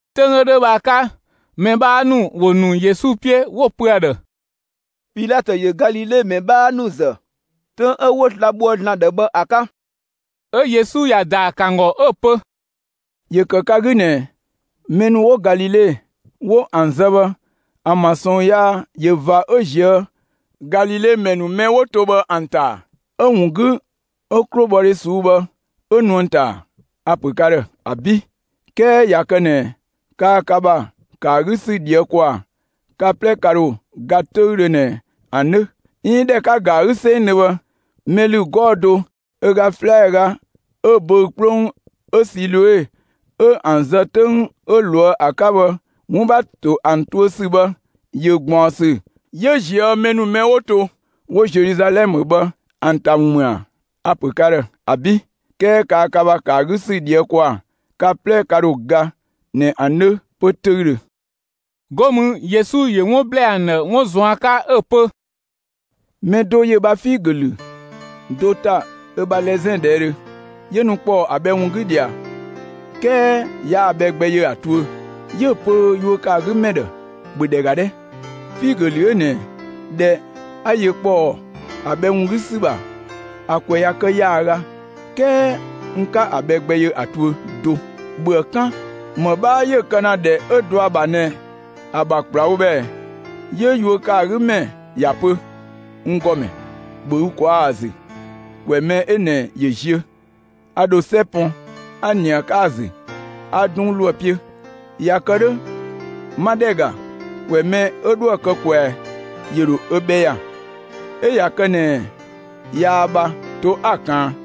'Töng 'ö 'dhö bhë ‑a 'ka, mɛ 'bhaa ‑nu ‑wo ‑nu Yesu 'piö, 'wo‑ pö ‑a ‑dhë: «Pilatö ‑yö Galile ‑mɛ 'bhaa ‑nu ‑zë 'töng 'ö 'wo sla‑ bhoë ‑Zlan ‑dhë bhë ‑a 'ka!» 'Ö Yesu ‑ya ‑daa ‑kë ‑an ‑gɔ 'ö‑ pö: «‑Yö ‑kë ka 'gü ꞊nɛ mɛ ‑nu 'wo Galile 'wo ‑an zë bhë, ‑an ‑bha ꞊sɔɔn yaa ꞊yö ꞊va 'ö ꞊zië' Galile ‑mɛ ‑nu mɛ 'wo to bhë ‑an ‑ta, 'ö‑ ‑wun 'gü 'ö 'klobhɔdhe ꞊suu'‑ bhë 'ö nu ‑an ‑ta ‑a? A‑ ‑pö ka ‑dhë: ‑Abi', 'kɛɛ ꞊ya kë ꞊nɛ kaa ka ‑bha ‑kë ‑a 'gü ‑sü ꞊dhië' ‑kwaa, ka 'plɛ ka ‑dho ga 'töüdhö ꞊nɛ ‑an 'dhö! 'Iin ꞊dhɛ 'ka‑ ‑ga ‑a 'gü 'sengdhö bhë, mɛ ‑lü 'gɔɔ‑ do ö ga 'slɛaga 'ö böü‑ 'kplong 'ö Siloe 'ö ‑an zë 'töng 'ö ꞊loë' ‑a 'ka bhë 'wun ‑bha ‑to ‑an tuö ‑sü bhë, ‑yö ꞊gbaɔnsü 'yö ꞊zië' mɛ ‑nu mɛ 'wo to 'wo Zeluzalɛmë bhë ‑an ‑ta ‑wun ‑mü ‑a? A‑ ‑pö ka ‑dhë: ‑Abi', 'kɛɛ kaa ka ‑bha ‑kë ‑a 'gü ‑sü ꞊dhië' ‑kwaa, ka 'plɛ ka ‑dho ga ꞊nɛ ‑an 'dhö 'pö 'töüdhö!» 'Go mü, Yesu ‑yö 'wun ‑blɛɛ ‑an ‑dhë 'wun ꞊zuan' 'ka 'ö‑ pö: «Mɛ do ‑yö ö ‑bha figö ‑lü do ‑ta ö ‑bha lɛzɛn ꞊dhɛɛdhö; 'yö nu ‑kpɔɔ ‑a bhɛ ‑wun 'gü ꞊dhia, 'kɛɛ yaa‑ bhɛ gbɛ yö ‑a tuö. 'Yö‑ pö yuö ‑kë ‑a 'gü ‑mɛ ‑dhë: ‹‑Bhö ‑dhɛ ‑ga 'dhɛ! Figö ‑lü 'ö ꞊nɛ, ꞊dhɛ 'a yö ‑kpɔɔ ‑a bhɛ ‑wun 'gü ‑sü ‑bha, ‑a ‑kwɛ kë ‑yaaga; 'kɛɛ n 'ka‑ bhɛ gbɛ yö ‑a tuö do. ‑Bhöë 'kan! ‑Më 'bhaa 'yö‑ kë ‑na ‑dhɛ 'ö dɔ ‑a ‑bha ꞊nɛ ‑a ‑bha ‑kplawo bhë ꞊ɛ?› 'Yö yuö ‑kë ‑a 'gü ‑mɛ ‑ya pö: ‹N ‑Gɔmɛ, ‑bhö ü ꞊kwaa' ‑a ‑zü ‑kwɛ mɛ 'ö ꞊nɛ ‑yö ziö, a ‑dho 'sɛ pɔn 'a ꞊nië ‑a 'ka ‑a ‑zü 'a 'dunng ‑lo ‑a 'piö. ꞊Ya kë 'dhö 'ma ‑dhɛ ‑ga, ‑kwɛ mɛ 'ö 'dhoë‑ kë ꞊kwɛa, ‑yö ‑dho ö bhɛ ‑ya, 'ö ꞊ya kë ꞊nɛ yaa bha, to 'a‑ ꞊kaan.›»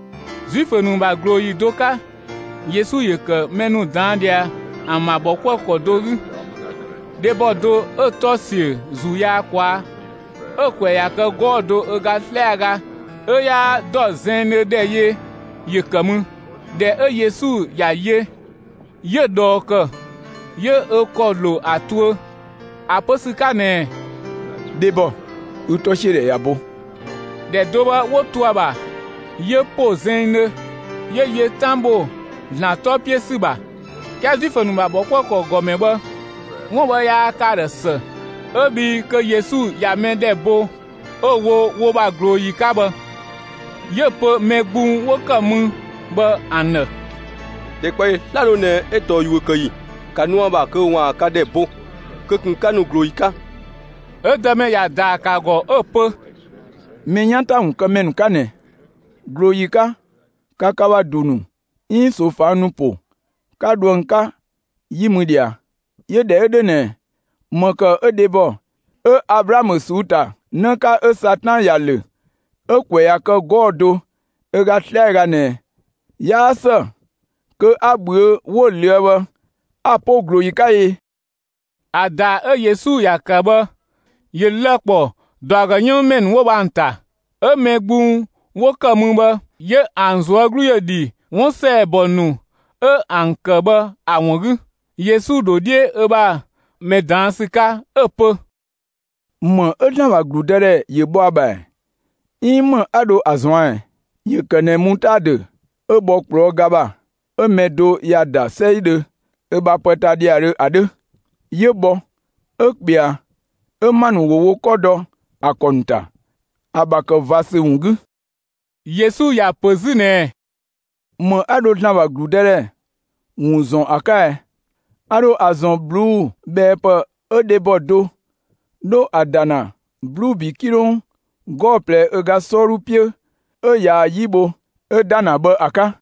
Zuifö ‑nu ‑bha ꞊glooyi do 'ka, Yesu ‑yö ‑kë mɛ ‑nu ꞊daan' ꞊dhia ‑an ‑bha ‑bhɔkuëkɔ do 'gü. Dhebɔ do 'ö‑ 'tɔ‑ ‑siö ‑zuu yaa ꞊kwaa', 'ö‑ ‑kwɛ ꞊ya kë 'gɔɔ‑ do ö ga 'slɛaga, 'ö 'yaa ‑dɔ zɛnngdhö ‑dhɛ yö ‑yö ‑kë mü. ꞊Dhɛ 'ö Yesu ‑ya yö, 'yö‑ ꞊dhɔɔ ‑kë 'yö ö ‑kɔ ‑lo ‑a tuö ‑a pö ‑sü 'ka ꞊nɛɛ: «Dhebɔ, ü 'tɔsiödhɛ ꞊ya bo!» ‑Dhɛ do bhë 'wo to ‑a ‑bha, 'yö ‑po zɛnngdhö, 'yö yö 'tan ‑bho ‑Zlan 'tɔ 'piö ‑sü ‑bha. 'Kɛɛ Zuifö ‑nu ‑bha ‑bhɔkuëkɔ ‑gɔmɛ bhë, 'wun bhë yaa kë ‑a ‑dhë ‑së 'ö bhii kö Yesu ꞊ya mɛ ‑dhɛ bo 'ö‑ wo wo ‑bha ꞊glooyi 'ka bhë. 'Yö‑ pö mɛ gbung 'wo ‑kë mü bhë ‑an ‑dhë: «‑Dhɛkpaɔyi 'slado ꞊nɛ 'ö tɔɔ yuö kë ‑yi, ‑ka nu ‑a ‑bha kö ‑waan ka ‑dhɛ bo, kö ꞊kun 'ka nu ꞊glooyi 'ka!» 'Ö Dëmɛ ‑ya ‑daa ‑kë ‑a ‑gɔ 'ö‑ pö: «Mɛ 'yan ‑ta ‑wun kë ‑mɛ ‑nu 'ka ꞊nɛ! ꞊Glooyi 'ka, ka ka ‑bha ‑du ‑nu 'iin ꞊soofang ‑nu ‑po 'ka dho ‑an 'ka 'yi mü ꞊dhia! 'Yö ꞊dhɛ 'ö 'dhö ꞊nɛ, ‑më ‑kë 'ö dhebɔ 'ö Ablaamö ꞊suu'‑ ‑ta ‑në 'ka 'ö Satan ‑ya ‑lö 'ö ‑kwɛ ꞊ya kë 'gɔɔ‑ do ö ga 'slɛaga ꞊nɛ, 'yaa ‑së kö 'a ꞊bhüö' 'wo ꞊löë' bhë ‑a 'po ꞊glooyi 'ka ɛ?» ‑A ‑daa 'ö Yesu ‑ya ‑kë bhë, ‑yö lë‑ ‑kpɔ ‑dɔ ‑a ‑gɔ 'yënng ‑mɛ ‑nu 'wo bhë ‑an ‑ta; 'ö mɛ gbung 'wo ‑kë mü bhë 'yö ‑an ꞊zuö' 'glu ‑yö dhi 'wun ‑sɛɛbɔ ‑nu 'ö ‑an kë bhë ‑a ‑wun 'gü. Yesu ‑dho 'dhiö ö bha mɛ ꞊daan' ‑sü 'ka, 'ö‑ pö: «‑Më 'ö ‑Zlan ‑bha ‑gludëdhɛ ‑yö bhɔ ‑a ‑bha ‑ɛ? 'Iin ‑më 'a dho ‑a ꞊zuan' ꞊ɛ? ‑Yö ‑kë ꞊nɛ mutaadö 'ö bhɔ ꞊kplɔɔ' ga ‑bha, 'ö mɛ do ‑ya ‑da 'sɛidhö ö bha pë ta ‑dhiadhö ‑a 'dhö; 'yö bhɔ, 'ö ꞊kpɛa 'ö ‑ma ‑nu ‑wo wo 'kɔ dɔ ‑a ‑kɔ ‑nu ‑ta, ‑a ‑bha kë ꞊va ‑sü ‑wun 'gü.» Yesu ‑ya ‑pö 'zü ꞊nɛɛ: «‑Më 'a dho ‑Zlan ‑bha ‑gludëdhɛ ‑wun ‑zɔn ‑a 'ka ɛ? A ‑dho ‑a ‑zɔn ꞊bluubhɛɛpë 'ö dhebɔ do 'dho ‑a ‑da ‑na 'bluubi 'kilong 'gɔɔ‑ ꞊plɛ ö ga 'sɔɔdhu 'piö 'ö ꞊yaa‑ 'yi bho 'ö ‑da ‑na bhë ‑a 'ka.»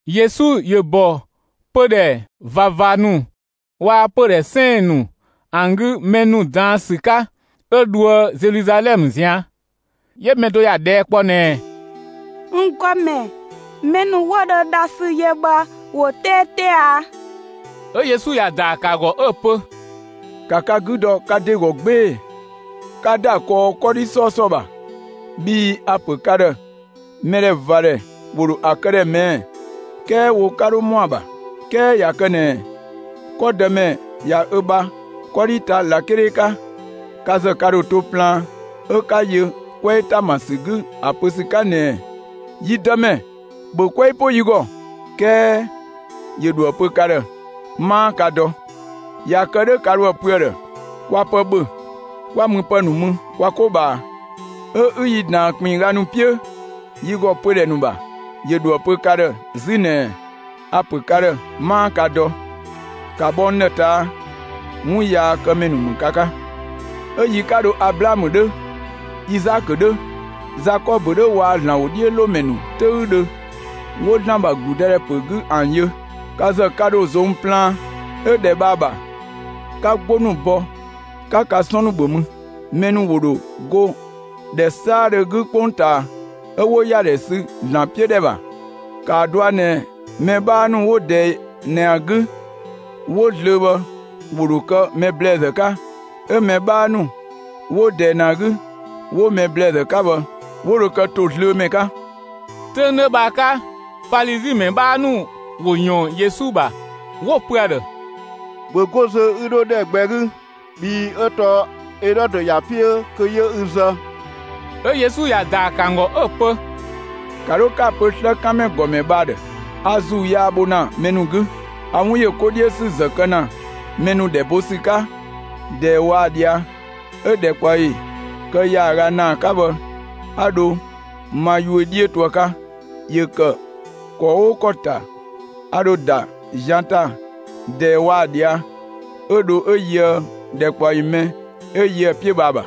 Yesu ‑yö ‑bɔ pödhɛ ꞊vava ‑nu waa‑ pödhɛ 'sɛɛn‑ ‑nu ‑an 'gü mɛ ‑nu ꞊daan' ‑sü 'ka, 'ö dhoë Zeluzalɛmë ꞊zian'. 'Yö mɛ do ‑ya ꞊dhɛɛ' kpɔ ꞊nɛɛ: «N ‑Gɔmɛ, mɛ ‑nu 'wo dho dhasü yö bhë, ‑wo 'teete ‑a?» 'Ö Yesu ‑ya ‑daa ‑kë ‑a ‑gɔ 'ö‑ pö: «‑Ka ka 'gü dɔ ka ‑de ‑gɔ 'gbee‑ 'ka ‑da kɔɔ 'kɔdhi 'sɔɔsɔ ‑bha, bhii a‑ ‑pö ka ‑dhë mɛdhɛvadhɛ ‑wo ‑dho ‑a kë ‑dhë ꞊mɛɛ', 'kɛɛ wo 'ka 'dho ‑mɔ ‑a ‑bha. 'Kɛɛ ꞊ya kë ꞊nɛ 'kɔ dëmɛ ꞊ya ö bha 'kɔdhi ta ꞊lakele 'ka, ka ‑zë ka ‑dho to plaan 'ö 'ka yö 'kwɛɛ ‑ta ‑ma ‑sü 'gü ‑a pö ‑sü 'ka ꞊nɛɛ: ‹Yi Dëmɛ, ‑bhö 'kwɛɛ 'po yi ‑gɔ!› 'Kɛɛ ‑yö ‑dhoë pö ka ‑dhë: ‹'Maa ka dɔ!› ꞊Ya kë 'dhö ka ‑dho ‑a pö ‑a ‑dhë: ‹Kwa pë ‑bhö 'kwa müpë ‑nu mü kwa 'ko ꞊bhaa, 'ö 'ü yi ꞊daan ‑kpinngga ‑nu 'piö yi ‑gɔ pödhɛ ‑nu ‑bha!› ‑Yö ‑dhoë pö ka ‑dhë 'zü ꞊nɛɛ: ‹A‑ ‑pö ka ‑dhë 'maa ka dɔ; ‑ka bhɔ n ‑dhë ꞊taa'! 'Wunyaakëmɛ ‑nu ‑mü ka 'ka!› 'Ö yi 'ka dho Ablaamö 'dhö, Izaakö 'dhö, Zakɔbö 'dhö waa‑ ‑Zlan ‑wodhiölomɛ ‑nu 'töüdhö 'wo ‑Zlan ‑bha ‑gludëdhɛ ‑pö 'gü ‑an yö, ka ‑zë ka ‑dho ꞊zong plaan, 'ö ‑dhɛ bhë ‑a ‑bha 'ka 'gbo ‑nu bɔ 'ka ka 'sɔn ‑nu ‑bhö mü. Mɛ ‑nu ‑wo ‑dho go ‑dhɛ 'saadhö 'gü 'kpongtaa, 'ö 'wo ‑yadhɛ sü ‑Zlan 'piö ‑dhɛ ‑bha. ‑Kaa dɔa ꞊nɛ mɛ 'bhaa ‑nu 'wo ꞊dɛɛ ꞊nɛ ‑a 'gü 'wo zlöö bhë 'wo dho kë mɛ ‑blɛɛzë 'ka, 'ö mɛ 'bhaa ‑nu 'wo ꞊dɛɛ ꞊nɛ ‑a 'gü 'wo mɛ ‑blɛɛzë 'ka bhë, 'wo dho kë ‑tozlöömɛ 'ka.» 'Töng 'dhö bhë ‑a 'ka, Falizi ‑mɛ 'bhaa ‑nu ‑wo ꞊yɔɔn Yesu ‑bha, 'wo‑ pö ‑a ‑dhë: «‑Bhö 'go zö 'ü 'dho ‑dhɛ gbɛ 'gü, bhii 'ö tɔɔ Elɔdö ‑ya 'piö kö 'yö ü zë!» 'Ö Yesu ‑ya ‑daa ‑kë ‑an ‑gɔ 'ö‑ pö: «‑Ka 'dho 'ka‑ pö 'slëkanmɛ ‑gɔmɛ bhë ‑a ‑dhë: A ‑zuu yaa bho ‑na mɛ ‑nu 'gü, a 'wun ‑yö 'ko 'dhiö ‑sü ‑zë kë ‑na mɛ ‑nu ‑dhɛ bo ‑sü 'ka ꞊dɛɛ waa‑ ꞊dhia', 'ö‑ ‑dhɛkpaɔyi kë ‑yaaga ‑naa 'ka bhë 'a dho ma yuö 'dhiö to ‑a 'ka. ‑Yö ‑kë ‑kɔ 'oo ‑kɔ ‑ta, a ‑dho ‑da zian ‑ta ꞊dɛɛ waa‑ ꞊dhia' 'ö dho 'ö yöë ‑dhɛkpaɔyi mɛ 'ö yö ‑a 'piö ‑a ‑bha.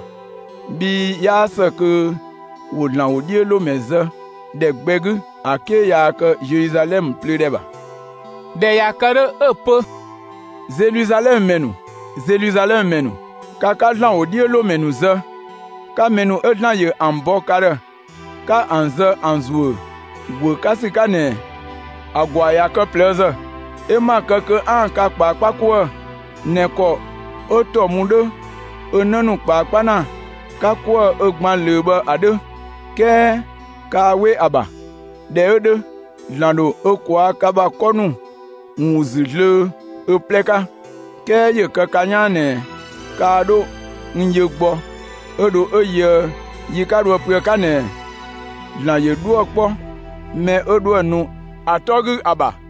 Bhii 'yaa ‑së kö ‑wo ‑Zlan ‑wodhiölomɛ zë ‑dhɛ gbɛ 'gü ‑a 'ke yaa kë Zeluzalɛmë plöö ‑dhɛ ‑bha.» ꞊Dhɛ ꞊ya kë 'dhö, 'ö‑ pö: «Zeluzalɛmë ‑mɛ ‑nu, Zeluzalɛmë ‑mɛ ‑nu, ka 'ka ‑Zlan ‑wodhiölomɛ ‑nu zë, 'ka mɛ ‑nu 'ö ‑Zlan ‑yö ‑an bɔ ka ‑dhë 'ka ‑an zë ‑an ‑zuö ‑guö 'ka ‑sü 'ka ꞊nɛ, ‑a ‑gwaa ꞊ya kë ꞊plëëzë, 'ö 'ma‑ kë kö 'aan‑ ka ꞊kpaakpa 'kuë‑ ꞊nɛ ‑kɔ 'ö ‑tɔ mu 'dhö ö 'në ‑nu ꞊kpaakpa ‑na 'ka 'kuë‑ ö gban ꞊löö bhë ‑a 'dhö! 'Kɛɛ kaa 'we ‑a ‑bha! ꞊Dhɛ 'ö 'dhö, ‑Zlan ‑dho ö ꞊kwaa' ka ‑bha 'kɔ ‑nu ‑wun ‑zü zlöö ö 'plɛ 'ka. 'Kɛɛ ‑yö kë ka 'yaan ꞊nɛ kaa 'dho n yö gbɔ 'ö dho 'ö yöë yi 'ka ‑dho ‑a pö ‑a 'ka ꞊nɛɛ: ‹‑Zlan ‑yö 'dhuë‑ 'kpɔ mɛ 'ö 'dhoë‑ nu ‑a 'tɔ 'gü ‑a ‑bha!›»